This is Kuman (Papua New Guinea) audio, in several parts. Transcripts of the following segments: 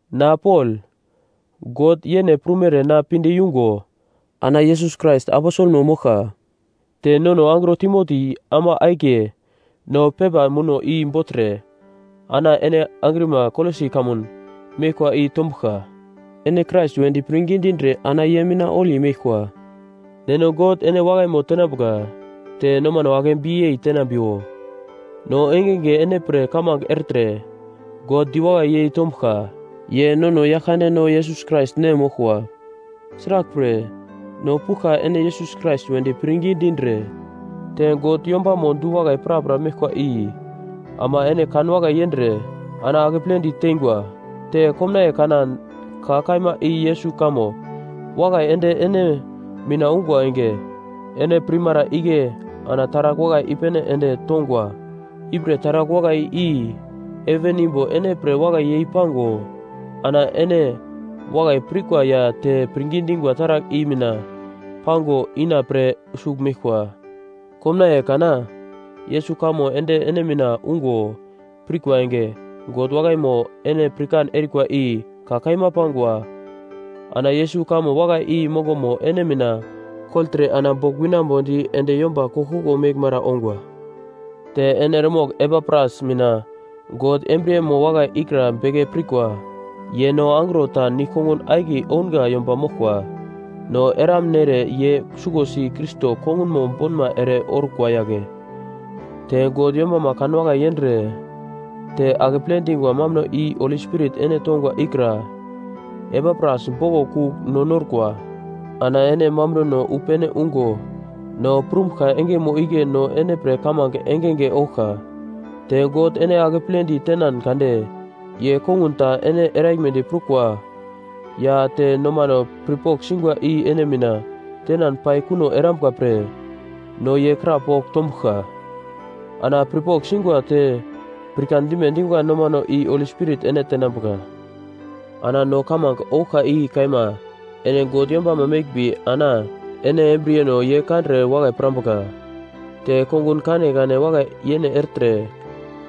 Na Pol, God yene prumere na pinde yungo ana Yesus Krais aposelmo moglka, te nono angro Timoti ama akiye no pepa muno i bogltre ana ene angrima Kolosi kamun meglkwa i tombuglka, ene Krais wedi pirngi dindre ana ye mina holi meglkwa. Neno God ene wakaimo tenambuka, te nomano akebi yei tenambiwo. No engenge ene pre kamange ertre God diwakai yei tombuglka, ye nono Yaglkandeno Yesus Krais Nem moglkwa. Sraglpre, no puglka ene Yesus Krais wedi pirngi dindre te God yombamo du-wakai prapra meglkwa i ama ene kanwakai yendre ana akepledi tengwa, te komnaiye kana ka kaima i Yesus kamo wakai ende ene mina ungwa enge, ene pirmara igle ana taragl wakai i-pene ende tongwa. Ipre taragl wakai i heven imbo ene pre wakai yei pago, ana ene wakai pirkwa ya te pirngi dingwa taragl i mina pago ina pre sugl meglkwa. Komnaiye kana Yesus kamo ende ene mina ungo pirkwa enge, God wakaimo ene pirkan erikwa i ka kaima pangwa. Ana Yesus kamo wakai i mongomo ene mina kogltre ana bogl winambodi ende yomba koglkoglo meglmara ongwa. Te ene eremogl Epapras mina God embriyemo wakai ikra beke pirkwa, ye no angro ta nigl kongun akiye ounga yomba moglkwa, no eramnere ye suglosi Krais kongunmo bonma ere orkwa yagle. Te God yombama kanwakai yendre te akeple dingwa mambuno i Holi Spirit ene tongwa ikra Epapras boglo kugl no norkwa. Ana ene mambunono wu pene ungo no prumbuglka engemo igle no ene pre kamange engenge ouglka. Te God ene akepledi tenan kade ye kongun ta ene eraglmedi prukwa ya te nomano pirpogl singwa i ene mina tenan pai kuno erambuka pre no ye kra pogl tombuglka. Ana pirpogl singwa te pirkan dime dingwa nomano i Holi Spirit ene tenambuka. Ana no kamange ouglka i kaima ene God yombama meglmbi, ana ene embriyeno ye kandre wakai pirambuka. Te kongun kanekane wakai yene ertre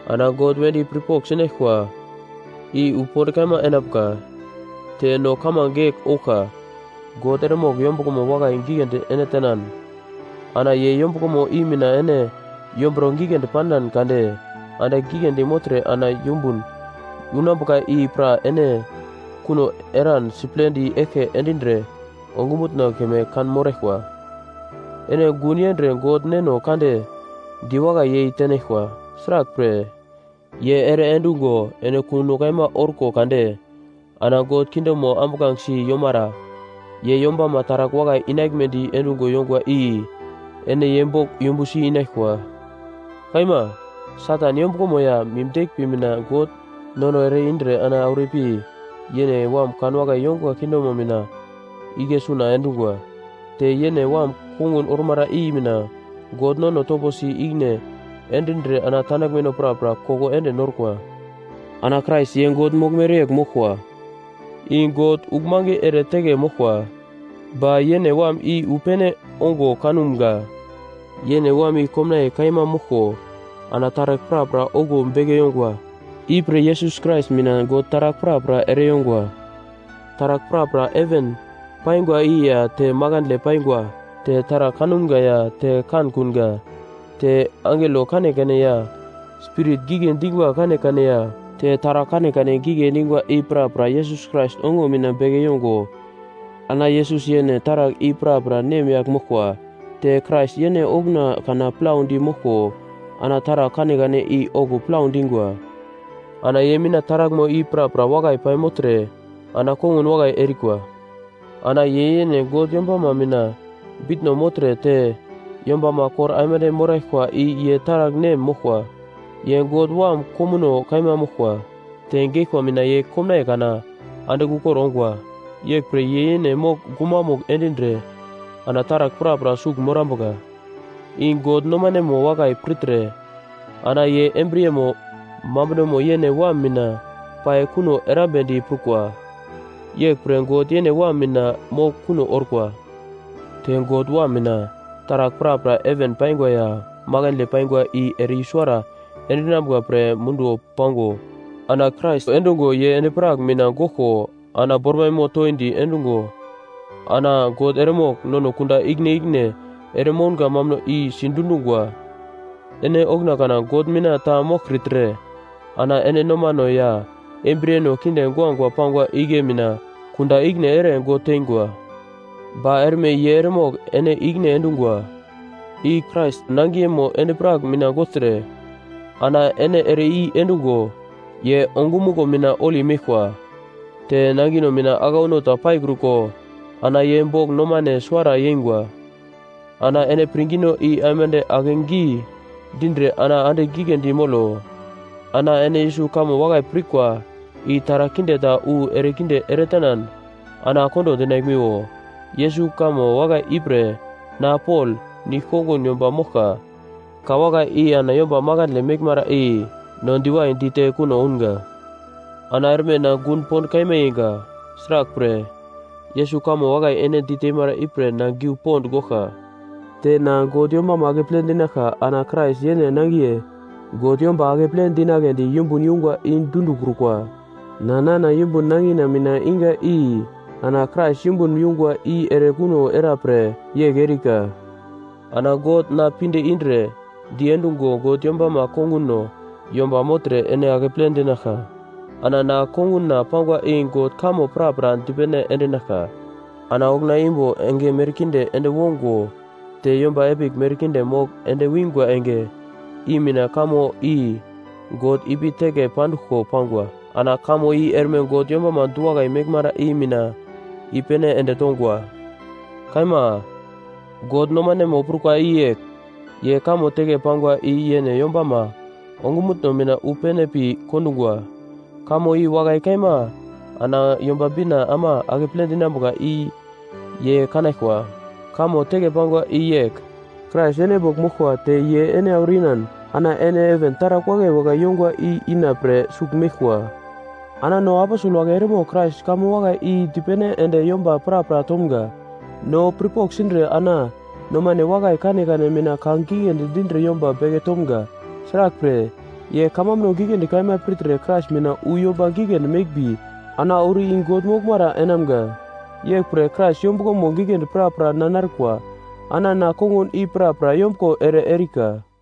ana God wedi pirpogl sinaglkwa i wu pond kaima enambuka. Te no kamange yegl ouglka: God eremogl yombuglomo wakai giglendi ene tenan, ana ye yombuglomo i mina ene yombro giglendi panan kade andigl giglendi mogltre ana yumbun unambuka i pra ene kuno eran siplendi eglke endindre ongumutno keme kanmoraglkwa. Ene gun yendre God Neno Kande diwakai yei tenaglkwa, sraglpre, ye ere endungo ene kuno kaima orko kade ana God kingdomo ambuglange si yomara ye yombama taragl wakai inaglmedi endungo yongwa i ene ye bogl yumbusi inaglkwa. Kaima, Satan yombuglomo ya mim deglmbi mina God nono ere-indre ana auro ipi yene Wam kanwakai yongwa kingdomo mina igle suna endungwa, te yene Wam kongun ormara i mina God nono toposi ikine endindre ana tandaglmeno prapra koko ende norkwa. Ana Krais ye God moglmere yegl moglkwa, i God uglmange ere teke moglkwa, ba yene Wam i wu pene ongo kanumga. Yene Wam i komnaiye kaima moglko ana taragl prapra okuwo beke yongwa. Ipre Yesus Krais mina God taragl prapra ere yongwa. Taragl prapra heven paingwa i ya te makandle paingwa, te taragl kanumga ya te kankunga, te angelo kanekane ya spirit gigle dingwa kanekane ya te taragl kanekane gigle dingwa i prapra Yesus Krais ongo mina beke yongwa. Ana Yesus yene taragl i prapra nemyagl moglkwa. Te Krais yene okuna kana plaudi moglko ana taragl kanekane i okuwo plau dingwa, ana ye mina taraglmo i prapra wakai paimogltre ana kongun wakai erikwa. Ana ye yene God yombama mina bitno mogltre te yombama kor aimande moraglkwa i ye taragl nem moglkwa. Ye God Wam komuno kaima moglkwa. Te geglkwa mina ye komnaiye kana andigl ukor ongwa. Yeglpre ye yene mogl gumamugl endindre ana taragl prapra sugl morambuka. I God nomanemo wakai pirtre ana ye embriyemo mambunomo yene Wam mina pai kuno erambedi prukwa, yeglpre God yene Wam mina mogl kuno orkwa. Te God Wam mina, taragl prapra heven paingwa ya makandle paingwa i ere i-suwara endinambuka pre munduwo pango ana Krais endungo ye endi-prak mina goglko ana bormaimo toindi endungo ana God eremogl nono kunda ikine ikine ere mounga mambuno i sidundungwa. Ene okuna kana God mina ta moglkritre ana ene nomano ya embriyeno kinde guagua pangwa igle mina kunda ikine ere God tengwa. Ba erme ye eremogl ene ikine endungwa, i Krais nangiyemo endi-prak mina gogltre ana ene ere i endungo ye ongumuglo mina holi meglkwa, te nangino mina aglauno ta paikruko ana ye bogl nomane suwara yeingwa. Ana ene pirngino i aimande akegi dindre ana andigl giglendi molo. Ana ene Yesus kamo wakai pirkwa i taragl kinde ta wu ere kinde eretenan ana kondo dinaglmiwo. Yesus kamo wakai ipre na Pol, nigl kongun yomba moglka. Ka wakai i ana yomba makandle meglmara i no diwai dite kuno ounga. Ana erme na gun pond kaima yeinga, sraglpre, Yesus kamo wakai ene diteimara ipre na giu pond goglka. Te na God yombama akeple dinaglka ana Krais yene nangiye God yomba akeple dinagledi yumbun yungwa i dundikrukwa. Na nana yumbun nangina mina iga i ana Krais yumbun yungwa i ere kuno era pre yegl erika. Ana God na pinde indre diendungo God yombama konguno yomba mogltre ene akeple dinaglka, ana na konguna pangwa i God kamo prapra dipene endinaglka. Ana okuna imbo enge merkinde ende wongo te yomba epigl merkinde mogl ende wingwa, enge i mina kamo i God ipi teke panduglko pangwa. Ana kamo i erme God yombama du-wakai meglmara i mina i-pene ende tongwa. Kaima, God nomanemo prukwa i yegl: Ye kamo teke pangwa i yene yombama ongumutno mina wu pene pi kondungwa. Kamo i wakai kaima ana Yomba Bina ama akeple dinambuka i ye kanaglkwa. Kamo teke pangwa i yegl, Krais ene bogl moglkwa te ye ene auro inan ana ene heven taragl wakai wakai yongwa i ina pre sugl meglkwa. Ana no aposel wagle eremogl Krais kamo wakai i dipene ende yomba prapra tomga. No pirpogl sindre ana nomane wakai kanekane mina ka giglendi dindre yomba beke tomga. Sraglpre, ye kamambuno giglendi kaima pirtre Krais mina wu yomba giglendi meglmbi ana auro i God moglmara enamga. Yeglpre, Krais yombuglo giglendi prapra na narkwa, ana na kongun i prapra yombuglo ere erika.